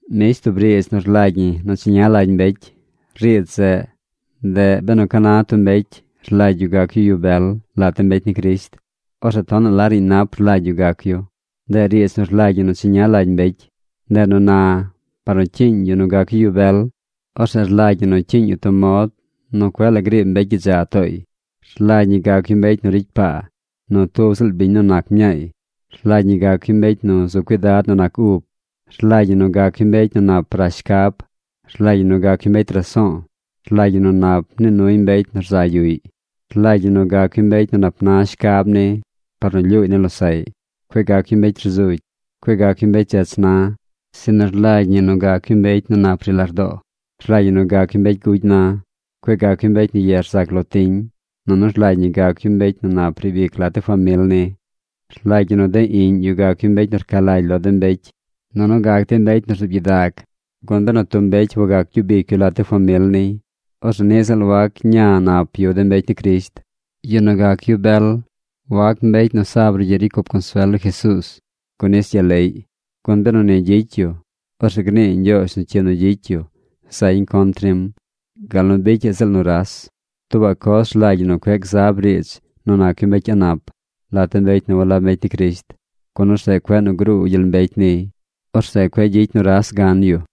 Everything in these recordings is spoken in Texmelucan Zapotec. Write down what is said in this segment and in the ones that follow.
Mbish tub riidz nu rlagy ñi nu cheña lagy mbecy. Riidz zeꞌ, ndeꞌ “Benu ca na tub mbecy rlagy yu gac yu yu bel lat de mbecy ni Crisht, orzeꞌ tonaꞌ la riiñ nap rlagy yu gac yu.” Ndeꞌ riidz nu rlagy ñi nu cheña lagy mbecy. Ndeꞌ nu na, par nu cyiiñ yu nu gac yu yu bel, orzeꞌ rlagy ñi nu cyiiñ yu tub mod nu cueꞌ la griib mbecy gyidza tooy. Rlagy ñi gac yu mbecy nu ricy paa nu tub ziꞌl biñ nu nac mñaay. Rlagy ñi gac yu mbecy nu zu cuidad nu nac ub. Rlagy ñi nu gac yu mbecy nu nap rash shcab. Rlagy ñi nu gac yu mbecy raso̱o̱. Rlagy ñi nu nap nii nuy mbecy nu rza yuꞌy. Rlagy ñi nu gac yu mbecy nu nap na shcab ni par nu lyuuy ni losaꞌy. Cueꞌ gac yu mbecy rzugy. Cueꞌ gac yu mbecy dzech na. Sinu rlagy ñi nu gac yu mbecy nu nap ri lardoo. Rlagy ñi nu gac yu mbecy gugy na. Cueꞌ gac yu mbecy nu ye rzac lo tiñ. Nunu rlagy ñi gac yu mbecy nu nap riib ic lat de famil ni. Rlagy ñi nu de iꞌñ yu gac yu mbecy nu rca lagy lo de mbecy nunu gac dey mbecy nu rzuub gyidag. Gun benu tub mbecy wagac gyub ic yu lat de famil niy, orzeꞌ niꞌ ziꞌl wac ña nap yu de mbecy ni Crisht. Yu nu gac yu bel wac mbecy nu sa brugyiꞌ ricy cup consuel lo Jesuuz, gun nis gyaleꞌy. Gun benu ni gyicy yu, orzeꞌ gnii Ñgyoozh nu cyi nu gyicy yu zañ contr nim gal nu bicyaꞌ ziꞌl nuras. Tuubaꞌ coz rlagy ñi nu cueꞌ gzab riidz nu nac yu mbecy a̱ꞌ nap lat de mbecy nu walab mbecy ni Crisht, gun orzeꞌ cueꞌ nu gruu gyel mbecy niy. Orzeꞌ cueꞌ gyicy nuras gan yu.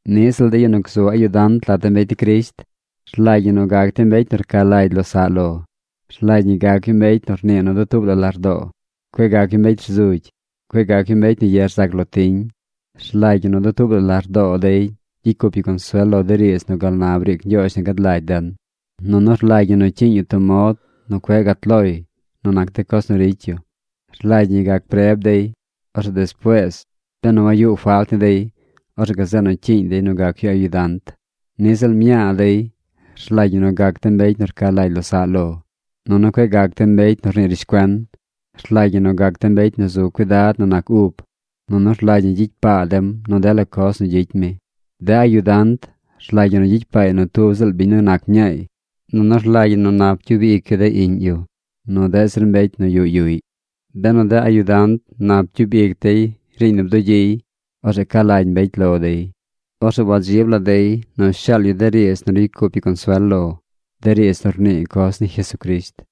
Niꞌ ziꞌl de yu nu gzu ayudant lat de mbecy ni Crisht rlagy ñi nu gac dey mbecy nu rca lagy losaꞌ lo. Rlagy ñi gac yu mbecy nu rnii nu dutuub la lardoo. Cueꞌ gac yu mbecy rzugy. Cueꞌ gac yu mbecy nu ye rzac lo tiñ. Rlagy ñi nu dutuub la lardoo dey gyicy cup yu consuel lo de riidz nu gal na briic Ñgyoozh nu gad lagy den. Nunu rlagy ñi nu cyiiñ yu tub mod nu cueꞌ gat loy nu nac de coz nu ricy yu. Rlagy ñi gac preb dey. Orzeꞌ despuees, benu wayuꞌ falt ni dey, orzeꞌ gazeꞌ nu cyiiñ dey nu gac yu ayudant. Niꞌ ziꞌl mñaa dey rlagy ñi nu gac dem mbecy nu rca lagy losaꞌ lo. Nunu cueꞌ gac dem mbecy nu rnii rishcuen. Rlagy ñi nu gac dem mbecy nu zu cuidad nu nac ub. Nunu rlagy ñi gyicy paa dem nu dela coz nu gyicy mi. De ayudant rlagy ñi nu gyicy paay nu tub ziꞌl biñ nu nac mñaay. Nunu rlagy ñi nu nap gyub ic yu de iꞌñ yu, nu deꞌ zir mbecy nu yuꞌ yuꞌy. Benu de ayudant nap gyub ic dey riiñ nu bdugyiy, orzeꞌ ca lagy mbecy lo dey. Orzeꞌ wadzib lagy la dey nu shaal yu de riidz nu ricy cup yu consuel lo, de riidz nu rnii coz ni Jesucrisht.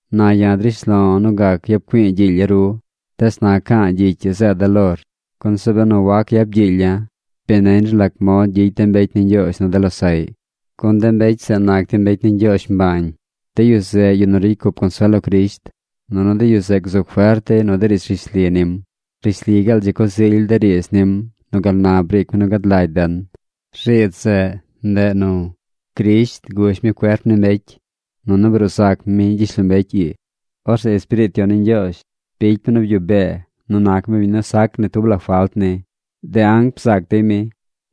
Na ya̱ drish lo̱ nu gac yap güi̱i̱ gyiilya̱ ru, tees na ca̱a̱ gyicy ii zeeda̱ lor, gun zeꞌ benu wac yap gyiilya̱, bi neñ ru lac mod gyicy de mbecy ni Ñgyoozh nu de losaꞌy, gun de mbecy zeꞌ nac dey mbecy ni Ñgyoozh mbañ. De yu zeꞌ yu nu ricy cup consuel lo Crisht, nunu de yu zeꞌ gzu fert dey nu de riidz rishli nim. Rishli gaal dzi coz ily de riidz nim nu gal na briic mi nu gad lagy den. Riidz zeꞌ, ndeꞌ nu: Crisht gush mi cuerp ni mbecy, nunu bruu zac mi gyishlombecy ii. Orzeꞌ Espiriit Yon ni Ñgyoozh bicy mi nu byuꞌ bee nu nac mi biñ nu sac ni tub la falt ni. De anc bzaac dey mi.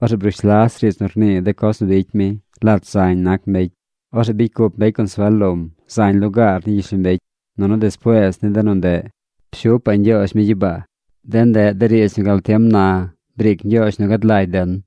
Orzeꞌ brush las riidz nu rnii de coz nu bicy mi lat zañ nac mbecy. Orzeꞌ bicy cup mbecy consuel lom zañ lugaar ni gyishlombecy. Nunu despuees ni de nu ndeꞌ, pshupaꞌ Ñgyoozh mi gyibaa. De ndeꞌ de riidz nu gal tiem na briic Ñgyoozh nu gad lagy den.